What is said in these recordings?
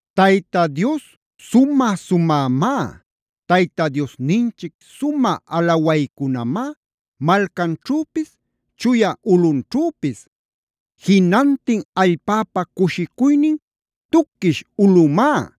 Tayta Dios sumä-sumämá. Tayta Diosninchic sumä alawaycunamá malcanćhüpis, chuya ulꞌunćhüpis. Jinantin allpäpa cushicuynin tuquish ulꞌümá.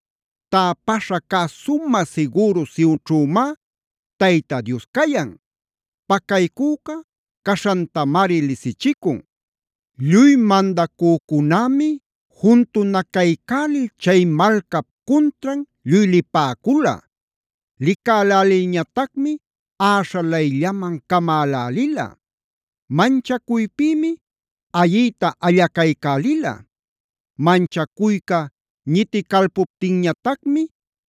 Täpaśha cä sumä sigüru Sionćhümá Tayta Dios cayan. Pacaycüca caśhantamari lisichicun. Lluy mandacücunämi juntunacaycälil chay malcap cuntran lluy lipäcula. Licälälilñatacmi äśhalayllaman camälälila. Manchacuypïmi ayiyta allacaycälila. Manchacuyca ñiticalpuptinñatacmi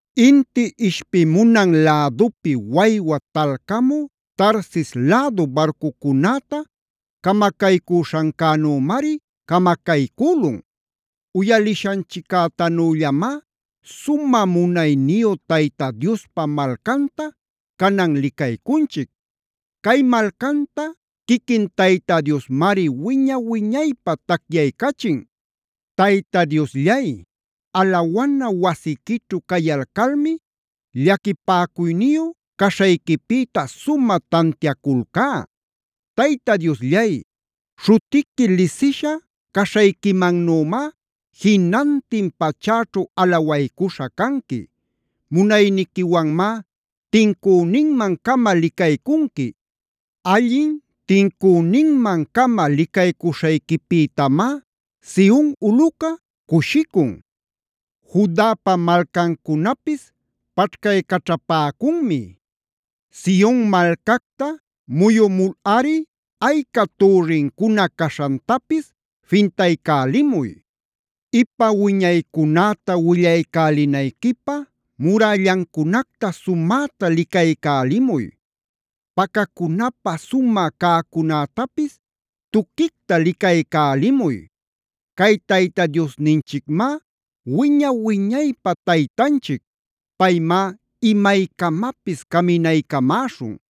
Inti ishpimunan lädupi waywa talcamü Tarsisc lädu barcucunäta camacaycüśhancänümari camacaycülun. Uyaliśhanchiccätanüllamá sumä munayniyu Tayta Diospa malcanta canan licaycunchic. Cay malcanta quiquin Tayta Diosmari wiña-wiñaypä tacyaycachin. Tayta Diosllay, alawana wasiquićhu cayalcalmi llaquipäcuyniyu caśhayquipïta sumä tantiaculcá. Tayta Diosllay, śhutiqui lisisha caśhayquimannümá jinantin pachäćhu alawaycuśha canqui. Munayniquiwanmá tincüninman-cama licaycunqui. Allin tincüninmancama licaycuśhayquipïtamá Sion ulꞌuca cushicun. Judapa malcancunapis paćhcaycaćhapäcunmi. Sion malcacta muyumulꞌari ayca türrincuna caśhantapis fintaycälimuy. Ipa wiñaycunäta willaycälinayquipä murällancunacta sumäta licaycälimuy. Pacacunapä sumä cäcunätapis tuquicta licaycälimuy. Cay Tayta Diosninchicmá wiña-wiñaypä Taytanchic. Paymá imaycamapis caminaycamäśhun.